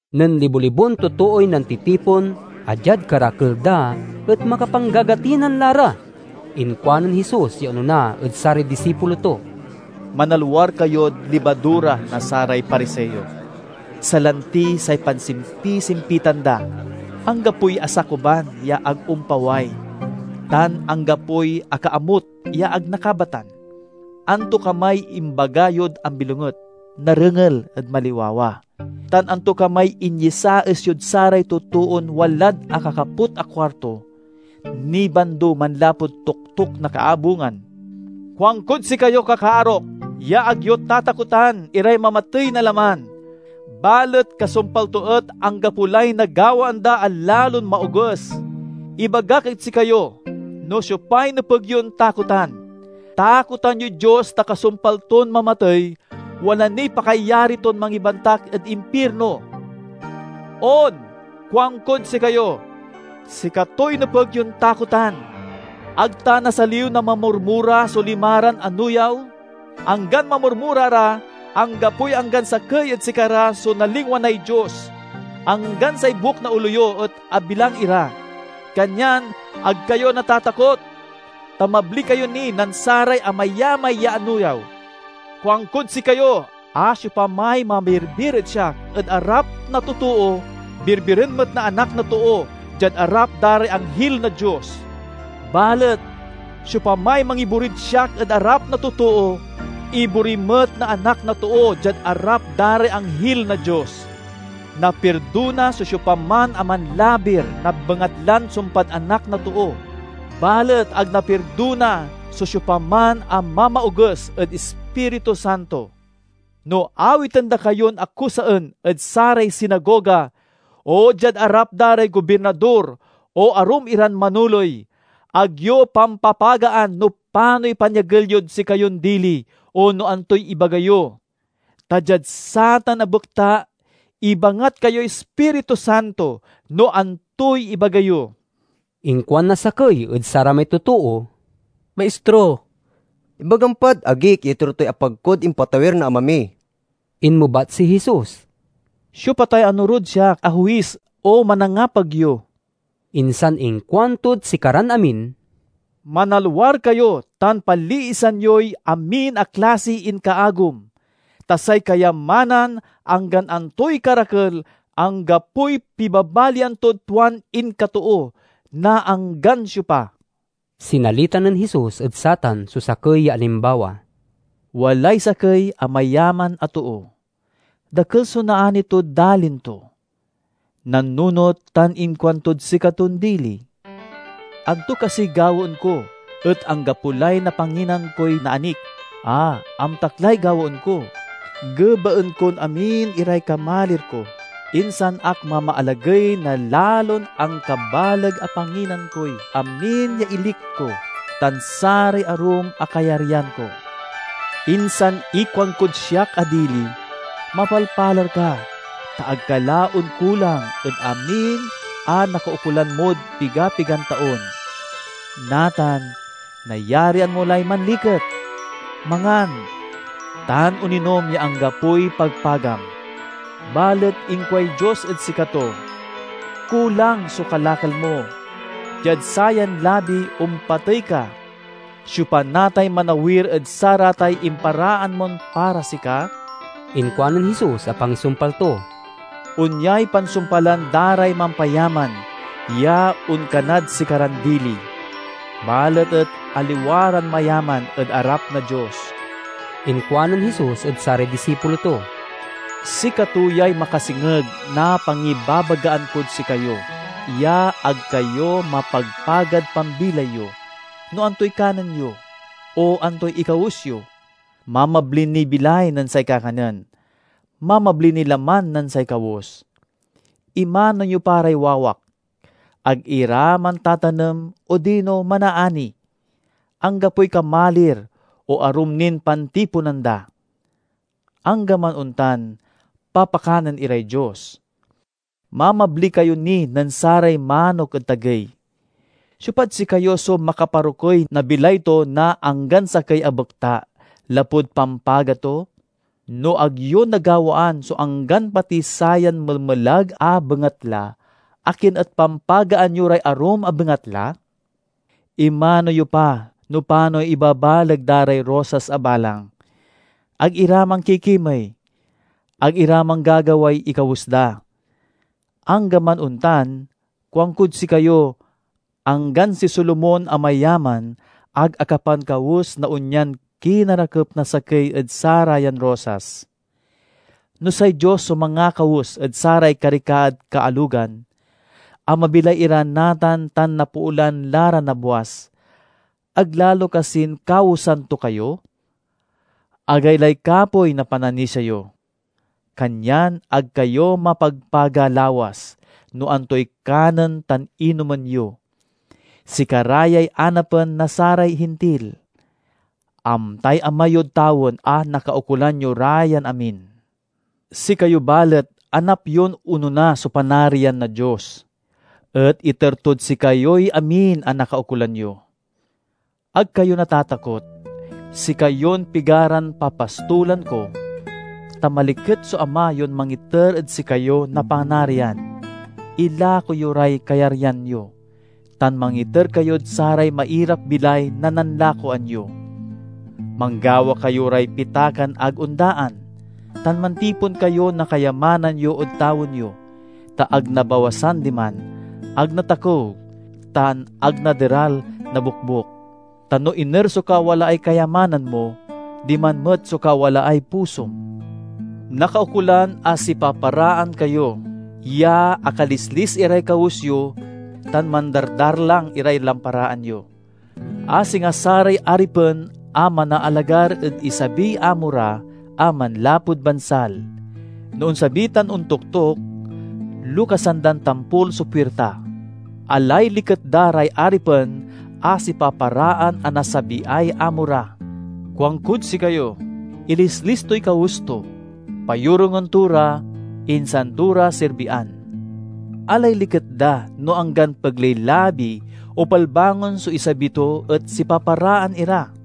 Nen libo-libon totooy nantitipon, a diad karakel da et makapanggagatinan la ra, inkuanen Jesus ya onona ed saray disipulo to, "Manalwar kayod libadura na saray Pariseo, salanti say pansimpisimpitan da. Anggapoy asakuban ya ag ompaway, tan anggapoy akaamut ya ag nakabatan. Antokamay imbaga yod ambilonget, narengel ed maliwawa; tan antokamay inyesaes yod saray totoon walad akakaput a kuarto, nibando manlapud toktok na kaabungan." "Kuankod sikayo, kakaarok, ya ag yo tatakotan iray mamatey na laman, balet kasumpal to et anggapo lay nagawaan da a lalon maoges. Ibagak ed sikayo no siopay nepeg yon takotan: takotan yoy Dios ta kasumpal ton mamatey, wala niy pakayari ton mangibantak ed impirno. On, kuankod sikayo, sikatoy nepeg yon takotan! "Ag ta nasaliw na mamurmura so limaran anuyaw? Anggan mamurmura ra, anggapoy anggan sakey ed sikara so nalingwanay Dios. Anggan say buek na olo yo et abilang ira. Kanyan ag kayo natatakot, ta mabli kayo ni nen saray amayamay ya anuyaw!" "Kuankod sikayo a siopamay mamirbir ed siak ed arap na totoo, birbiren met na Anak na Too diad arap da ray anghil na Dios! Balet siopamay mangiborid siak ed arap na totoo, ibori met na Anak na Too diad arap da ray anghil na Dios. "Napirdona so siopaman a manlabir na bengatlan sumpad Anak na Too; balet ag napirdona so siopaman a mamaoges ed Ispiritu Santo. "No awiten da kayon akusaen ed saray sinagoga o diad arap da ray gobirnador o arum iran manoley, ag yo pampapagaan no panoy pangyagel yod sikayon dili o no antoy ibaga yo. Ta diad satan a bekta, ibangat kayoy Ispirutu Santo no antoy ibaga yo." Inkuan na sakey ed saramay totoo, "Maistro, ibagam pad agik ya iter toy apag kod impatawir na ama mi." Inmebat si Jesus, "Siopa tay anorod siak a huis o manangapag yo?" Insan inkuantod sikaran amin, "Manalwar kayo tan paliisan yoy amin a klasiy inkaagum; ta say kayamanan, anggan antoy karakel, anggapoy pibabalian tod tuan inkatoo na anggan siopa." Sinalita nen Jesus ed satan so sakey ya alimbawa: "Walay sakey a mayaman a too. Dakel so naani tod dalin to. Nannunot tan inkuantod sikaton dili, 'Anto kasiy gawaen ko, et anggapo lay napanginan koy naanik? A, amtak lay gawaen ko! Gebaen kon amin iray kamalir ko, insan ak mamaalagey na lalon ankabaleg a panginan koy amin ya ilik ko tan saray arum a kayaryan ko. Insan ikuankod siak a dili, Mapalpalar ka, ta ag ka la onkulang ed amin a nakaukolan mod pigapigan taon. Natan, nayarian mo lay manliket, mangan, tan oninom ya anggapoy pagpagam!' Balet inkuay Dios ed sikato, 'Kulang so kalakal mo! Diad sayan labi, ompatey ka. Siopa natay manawir ed saratay imparaan mon para sika?'" Inkuanen Jesus a pangisumpal to, "Onyay pansumpalan da ray mampayaman ya onkanad sikaran dili, balet et aliwa ran mayaman ed arap na Dios." Inkuanen Jesus ed saray disipulo to, "Sikato yay makasengeg na pangibabagaan kod sikayo ya ag kayo mapagpagad pambilay yo, no antoy kanen yo, o antoy ikawes yo. Mamabli niy bilay nen say kakanen; mamabli niy laman nen say kawes. Imano yo pa ray wawak! Ag ira mantatanem odino manaani, anggapoy kamalir o arum nin pantiponan da. Anggaman ontan, papakanen iray Dios! Mamabli kayo ni nen saray manok ed tagey! Siopad sikayo so makaparokey na bilay to na anggan sakey a bekta, lapud pampaga to? No ag yo nagawaan so anggan pati sayan melmelag a bengatla, akin et pampagaan yo ray arum a bengatla? Imano yo pa no panoy ibabaleg da ray rosas a balang. Ag ira mankikimey; ag ira manggagaway ikawes da. Anggaman ontan, kuankod sikayo, anggan si Solomon a mayaman ag akapankawes na onyan kinarakep na sakey ed sarayan rosas. No say Dios so mangakawes ed saray karikaad kaalogan, a mabilay ira natan tan napoolan la ra nabwas, ag lalo kasin kawesan to kayo? Agaylay kapoy na pananisia yo! Kanyan ag kayo mapagpaga lawas no antoy kanen tan inomen yo. Sikara yay anapen na saray Hintil. Amtay Ama yod tawen a nakaukolan yo ra yan amin. Sikayo, balet, anap yon onona so Panarian na Dios, et iter tod sikayoy amin a nakaukolan yo." "Ag kayo natatakot, sikayon pigaran papastolan ko, ta maliket so Ama yon mangiter ed sikayo na Panarian. Ilako yo ray kayaryan yo, tan mangiter kayod saray mairap-bilay na nanlakoan yo. Manggawa kayo ray pitakan ag ondaan, tan mantipon kayo na kayamanan yo ed tawen yo, ta ag nabawasan diman, ag natakew, tan ag naderal na bokbok. Ta no iner so kawalaay kayamanan mo, diman met so kawalaay pusom." "Nakaukolan a sipaparaan kayo, ya akalislis iray kawes yo tan mandardarlang iray lamparaan yo, a singa saray aripen a manaalagar ed isabiy amo ra a manlapud bansal. No onsabi tan ontoktok, lokasan dan tampol so puirta. Alay liket da ray aripen a sipaparaan a nasabiay amo ra. Kuankod sikayo, ilislis toy kawes to, payorungen to ra, insan to ra serbian. Alay liket da no anggan pegley-labi o palbangon so isabi to et sipaparaan ira!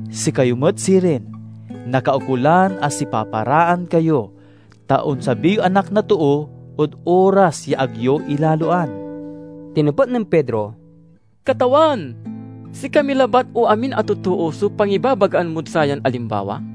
Sikayo met sirin, nakaukolan a sipaparaan kayo, ta onsabiy Anak na Too ed oras ya ag yo ilaloan." Tinepet nen Pedro, "Katawan, sikami labat o amin a totoo so pangibabagaan mod sayan alimbawa?"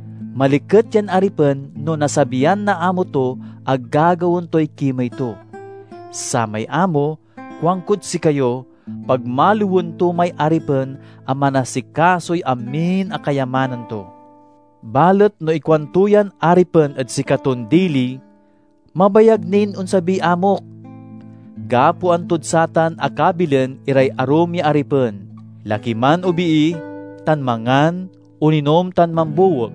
Maliket yan aripen no nasabian na amo to a gagawaen toy kimey to! Samay amo, kuankod sikayo, pagmaliwen to may aripen a manasikasoy amin a kayamanan to. Balet no ikuanto yan aripen ed sikaton dili, 'Mabayag nin onsabiy amok.' Gapoan tod satan a kabilen iray arum ya aripen, laki man o bii, tan mangan, oninom tan mambuwek.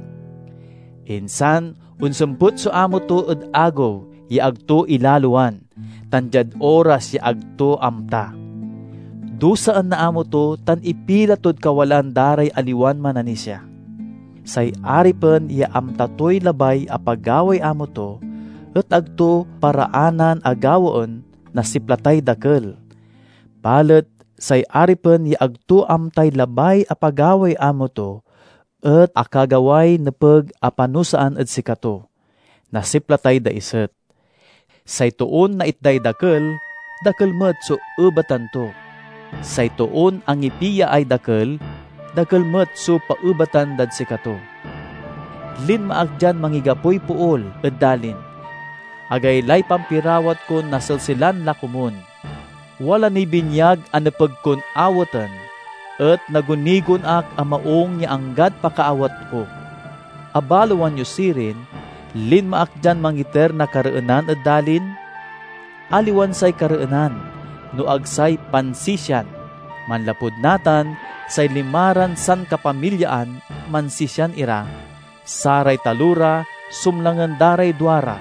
Insan onsempet so amo to ed agew ya ag to ilaloan tan diad oras ya ag to amta. Dusaen na amo to tan ipila tod kawalaan da ray aliwan mananisia. "Say aripen ya amta toy labay a pagaway amo to et ag to paraanan a gawaen, nasiplatay dakel. Balet say aripen ya ag to amtay labay a pagaway amo to et akagaway nepeg a panusaan ed sikato, nasiplatay daiset. Say toon naitday dakel, dakel met so ebatan to. Say toon angipiaay dakel, dakel met so paebatan dad sikato." "Linma ak dian mangigapoy pool ed dalin. Agaylay pampirawat kon naselselan la komun! Wala niy binyag a nepeg kon awaten, et nagunigon ak a maung ya anggad pakaawat ko! Abaloan yo sirin, linma ak dian mangiter na kareenan ed dalin? Aliwan say kareenan, no ag say pansisian. Manlapud natan, say limaran sankapamilyaan mansisian ira; saray talora sumlangen da ray duara,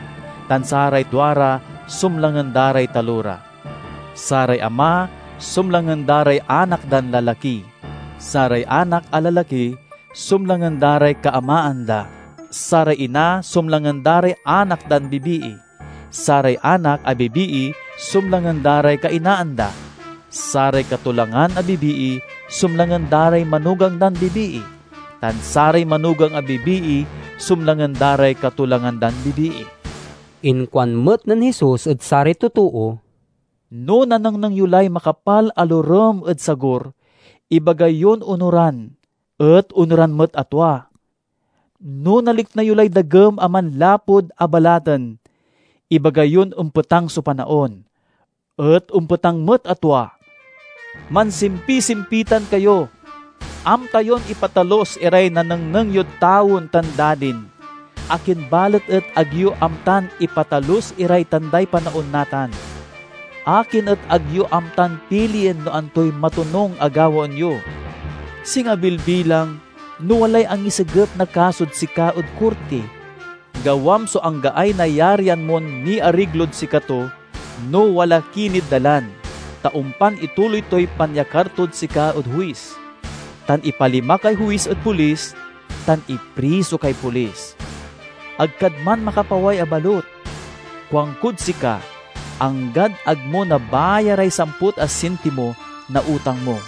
tan saray duara sumlangen da ray talora. Saray ama sumlangen da ray anak dan lalaki; saray anak a lalaki sumlangen da ray kaamaan da. Saray ina sumlangen da ray anak dan bibii; saray anak a bibii sumlangen ray kainaan da. Saray katolangan a bibii sumlangen da ray manugang dan bibii, tan saray manugang a bibii sumlangen da ray katolangan dan bibii." Inkuan met nen Jesus ed saray totoo, "No nanengneng yo lay makapal a lorem ed sagur, ibaga yon onoran, et onoran met a tua. No nalikna yo lay dagem a manlapud abalaten, ibaga yon ompetang so panaon, et ompetang met a tua. Mansimpisimpitan kayo! Amta yon ipatalus iray nanengneng yod tawen tan dalin, akin balet et ag yo amtan ipatalus iray tanday panaon natan?" "Akin et ag yo amtan pilien no antoy matonung a gawaen yo? Singa bilbilang, no walay angisegep na kasod sika ed korti, gawam so anggaay nayarian mon miariglod sikato no wala ki nid dalan, ta ompan ituloy toy pangyakar tod sika ed huis, tan ipalima kay huis ed polis, tan ipriso kay polis. Ag kad man makapaway a balut, kuankod sika, anggad ag mo nabayaray samput a sentimo na utang mo."